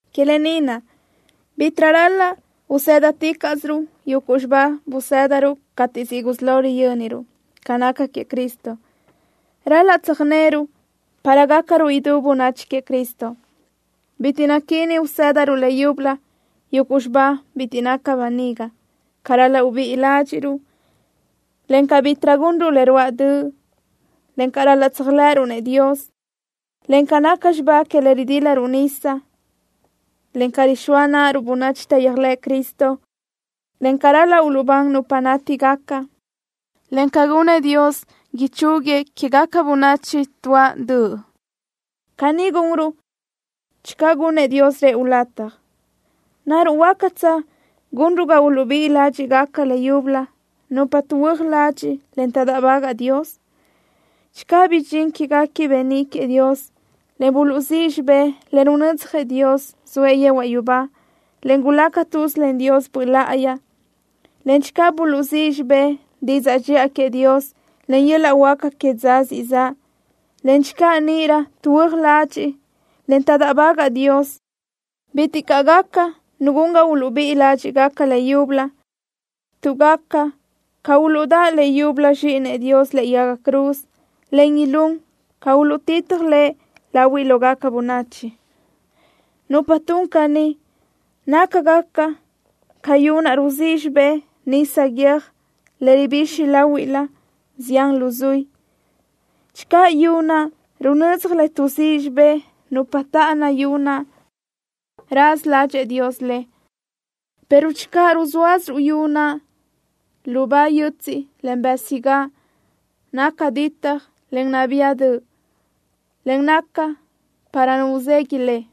Que lë ni naʼ, bitiʼ ral-laʼ usë́daticaʼsiruʼ yuguʼ xibá buzë́daruʼ cateʼ siʼ gusí lo riyö́niruʼ ca naca queëʼ Cristo. Ral-laʼ tsöjnö́röruʼ para gácaruʼ idú bönachi queëʼ Cristo. Bitiʼ naquíni usë́daruʼ leyúbölö yuguʼ xibá bitiʼ naca böniga: ca ral-laʼ ubíʼi ládxiʼruʼ, en ca bítiʼrö gunruʼ le ruáʼ döʼ, en ca ral-laʼ tséajlëʼëruʼ-nëʼ Dios, en ca naca xibá que le ridílaruʼ nisa, en ca rixóa náʼaruʼ bönachi taʼyéajlëʼ Cristo, en ca ral-laʼ uluʼbán nupa nátigaca, en ca gunëʼ Dios, ichúguiëʼ quégaca bönachi tuáʼ döʼ. Caní gunruʼ channö gunnëʼ Dios rëʼu lataj. ¿Naruʼ huácatsö gunruʼ ga uluʼbíʼi ládxiʼgaca leyúbölö nupa tuʼhuö́aj ladxiʼ, en taʼdáʼbagaʼ Dios? Channö bidxín quéguequi beníʼ queëʼ Dios, en buluʼzíʼ xibé le runödzjëʼ Dios zoëʼ yehuaʼ yubá, en gulaca tuz len Dios Böʼ Láʼayi, en channö buluʼzíʼ xibé didzaʼ dxiʼa queëʼ Dios en yöl-laʼ huáca que dza siʼ zaʼ, en channö níʼirö tuʼhuö́aj ladxiʼ, en taʼdáʼbagaʼ Dios, bitiʼ caʼ gaca nu gun ga uluʼbíʼi ládxiʼgaca leyúbölö, tuʼ gaca tsca uluʼdáʼ leyúbölö Zxíʼinëʼ Dios lëʼe yaga cruz en ilún tsca uluʼtitaj Lëʼ lahuiʼ lógaca bönachi. Nupa tun caní nácagaca ca yu naʼ ruzíʼ xibé nisa guiö́j le ribixi láhuilö zián luzuí. Channö yu naʼ runödzaj le tuʼzíʼ xibé nupa táʼana yu naʼ, raza ládxëʼë Dios le, pero channö ruzóasö yu naʼ lubá yötsiʼ, en bësigáʼ, naca ditaj, en nabía döʼ, en naca para nu uzegui le.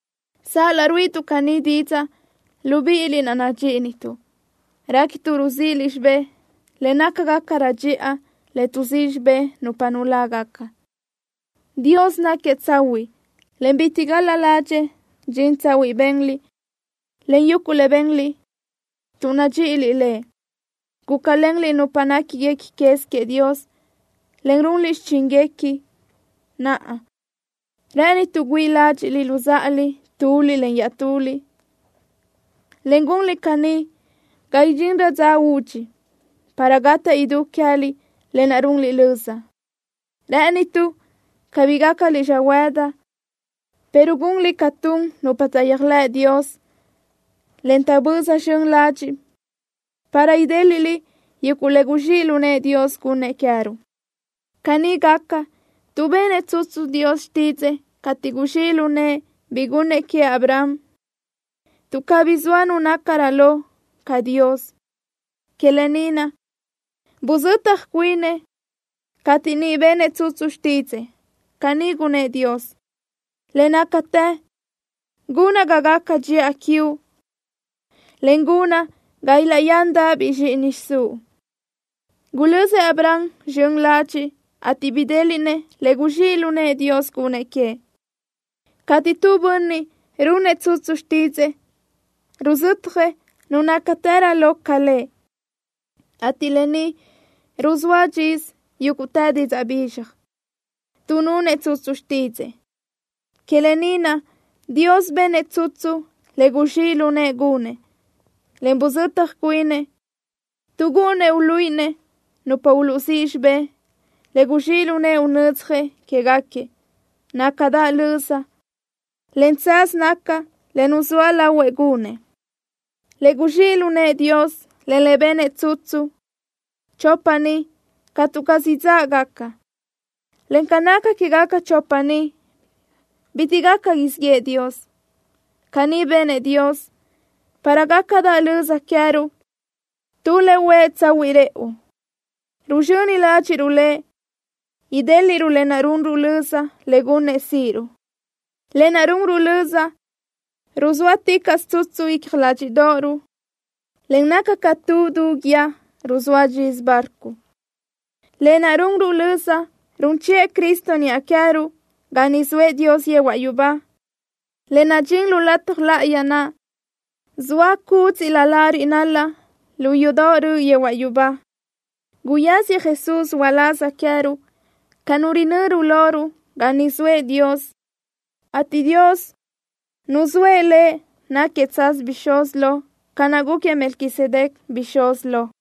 Sal-laʼ ruíʼituʼ caní didzaʼ, libíʼiliʼ naʼ nadxíʼituʼ, réquituʼ ruzíʼiliʼ xibé le nácagacarö dxiʼa, le tuʼzíʼ xibé nupa nulágaca. Dios náquiëʼ tsahuiʼ, en bitiʼ gal-la ládxëʼë dxin tsahuiʼ benliʼ, en yuguʼ le benliʼ tuʼ nadxíʼiliʼ Lëʼ. Gúcalenliʼ nupa néquiguequi quez queëʼ Dios, en runliʼ xichínguequi. Naʼa, rë́ʼënituʼ güíʼi ládxiʼliʼ luzáʼaliʼ tu iaʼtuliʼ, en gunliʼ caní ga idxinrö dza údxi, para gataʼ idú queë́liʼ lë naʼ runliʼ löza. Rë́ʼënituʼ cabí gácaliʼ xöhuëdi, pero gunliʼ ca tun nupa taʼyéajlëʼ Dios, en taʼböza zxön ladxiʼ, para idéliʼliʼ yuguʼ le guzxíʼ lu nëʼë Dios gunnëʼ queë́ruʼ. Caní gaca, tuʼ benëʼ tsutsu Dios xtídzëʼë cateʼ guzxíʼ lu nëʼë bi gunnëʼ queëʼ Abraham. Tuʼ cabí zoa nu nácarö lo ca Dios, que lë ni naʼ buzetaj cuinëʼ, cateʼ niʼ benëʼ tsutsu xtídzëʼë. Caní gunnë́ʼ Dios: “Le nácatë gunaʼ ga gaca dxiʼa quiuʼ, en gunaʼ ga ilaʼyándaʼabiʼ zxíʼini xiʼsúʼ.” Gulözëʼ Abraham zxön ladxiʼ, ateʼ bidéliʼnëʼ le guzxíʼ lu nëʼë Dios gunnëʼ queëʼ. Cateʼ tu bönniʼ runëʼ tsutsu xtídzëʼë, ruzötjëʼ nu nácatërö lo ca lëʼ, ateʼ lë ni ruzóa dxisö yúguʼtë didzaʼ bizxaj, tuʼ nunëʼ tsutsu xtídzëʼë. Que lë ni naʼ Dios benëʼ tsutsu le guzxíʼ lu nëʼë gunëʼ, en buzötaj cuinëʼ, tuʼ gúʼunnëʼ uluíʼinëʼ nupa uluʼzíʼ xibé le guzxíʼ lu nëʼë unödzjëʼ quéguequi, nácadaʼ löza, en tsaz naca le nuzóa lahuëʼ gunëʼ. Le guzxíʼ lu nëʼë Dios, en le benëʼ tsutsu, chopa ni catu caz idzáʼgaca, en ca naca quégaca chopa ni, bitiʼ gaca siʼ yëʼë Dios. Caní benëʼ Dios para gácadaʼ löza queë́ruʼ tu le huë tsahuiʼ rëʼu. Ruzxöni ládxiʼruʼ Lëʼ idéliʼruʼ lë naʼ runruʼ löza le gunnë́ʼ síʼiruʼ. Lë naʼ runruʼ löza ruzóaticaʼsö tsutsu icja ládxiʼdoʼoruʼ, en naca ca tu du guíë ruzóa dxisö barco. Lë naʼ runruʼ löza run chiʼë Cristo niʼa queë́ruʼ ga niʼ zoëʼ Dios yehuaʼ yubá, le nadxín lu lataj láʼayi naʼ zoa cúdziʼlö lariʼ nalaʼ lu yudoʼ röʼö yehuaʼ yubá. Guyáziëʼ Jesús uláz queë́ruʼ ca Nu röjnöru loruʼ ga niʼ zoëʼ Dios, ateʼ Dios nuzóëʼ Lëʼ náquiëʼ tsaz bixúz lo ca naʼ gúquiëʼ Melquisedec bixúz lo.